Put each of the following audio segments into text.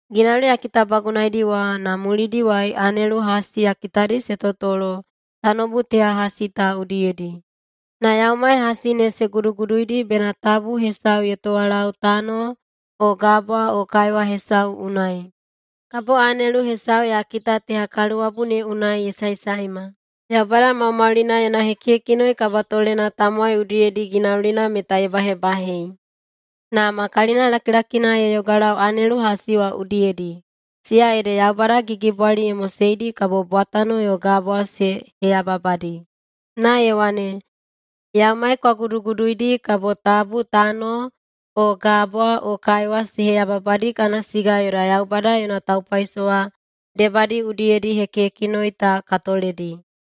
Ginauli ya kitabagunaidi wa na mulidiwai anelu hasi ya kitadi se totolo tanoubu teha hasi ta udiyedi, na yaumai hasi ne se guduguduidi bena tabu hesau ye towalau tano o gabwa o kaiwa hesau unai. Kabo anelu hesau ya kita teha kaluwabu ne unai ye saesaema, Yaubada Maumaulina yona hekihekinoi kabatolena tamowai udiyedi ginaulina meta ye bahebahei. Na ma kalinalakilakina ye yogalau anelu hasi wa udiyedi, siya ede Yaubada gigibwali ye moseidi kabo bwatano yo gabwa se heyababadi, na ye wane, “Yaumai kwa guduguduidi kabo tabu tano o gabwa o kaiwa se heyababadi kana siga yoda Yaubada yona taupaisowa debadi udiyedi hekihekinoi ta ka toledi.”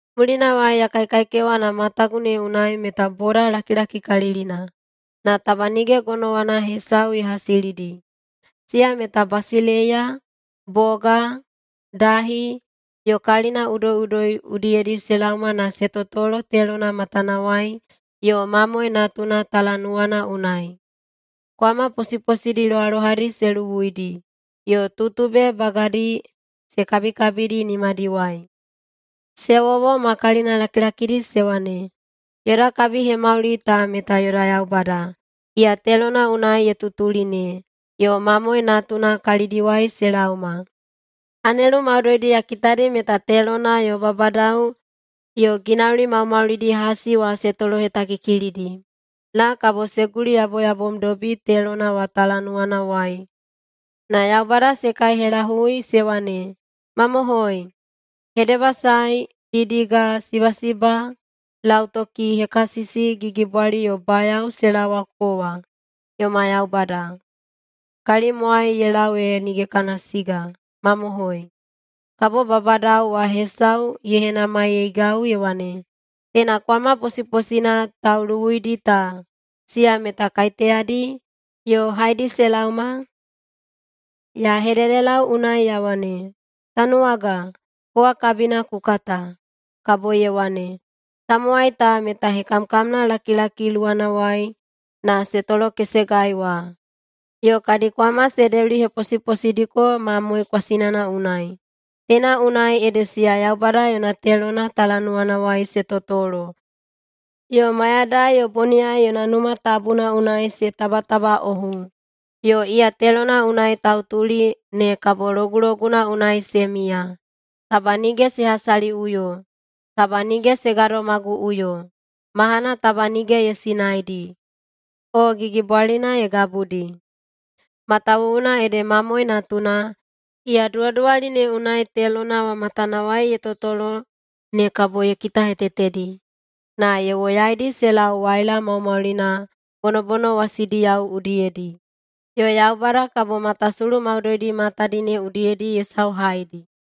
Mulinawai ya kaikaikewa na matagu ne unai meta boda lakilakikalilina, na taba nige gonowana hesau ye hasilidi. Siya meta basileiya, boga, dahi, yo kalina udoiꞌudoi udiyedi se laoma na se totolo telona matanawai yo Mamoe Natuna talanuwana unai. Kwama posiposidi lohalohadi se luwuidi, yo tutube bagadi se kabikabidi nimadiwai. Se wowo ma kalina lakilakidi se wane, “Yoda kabihemauli ta meta yoda Yaubada, iya telona unai ye tutuli ne, yo Mamoe Natuna kalidiwai se laoma!” Anelu maudoidi ya kitadi meta telona yo babadao yo ginauli maumaulidi hasi wa se tolohetakikilidi, na kabo se guliyaboyabomdobi telona wa talanuwanawai na Yaubada se kaihelahui se wane, “Mamohoi! Hedebasae, didiga, sibasiba, lautoki, hekasisi, gigibwali yo bayao se laowa kowa, yoma Yaubada, kalimwai ye lau ee nige kana siga. Mamohoi!” Kabo babadao wa hesau ye henamaiyeigau ye wane, “Teina kwama posiposina tauluwuidi ta, siya meta kaiteyadi, yo haedi se laoma?” Ya hededelau unai ya wane, “Tanuwaga, kowa kabina ku kata.” Kabo ye wane, “Tamowai ta meta hekamkamnalakilaki luwanawai na se tolokesegai wa, yo kadi kwama se deuliheposiposidiko Mamoe kwasinana unai. Teina unai ede siya Yaubada yona telona talanuwanawai se totolo yo mayadai yo boniyai yona Numa Tabuna unai se tabatabaꞌohu, yo iya telona unai tautuli ne kabo loguloguna unai se miya. Taba nige se hasaliꞌuyo. Taba nige se gadomaguꞌuyo. Mahana taba nige ye sinaidi, o gigibwalina ye gabudi. Matawuwuna ede Mamoe Natuna, iya duwaduwali ne unai telona wa matanawai ye totolo ne kabo ye kitahetetedi, na ye woyaidi se lau waila maumaulina bonobonowasidiyao udiyedi. Yo Yaubada kabo matasulu maudoidi matadi ne udiyedi ye sauhaidi.”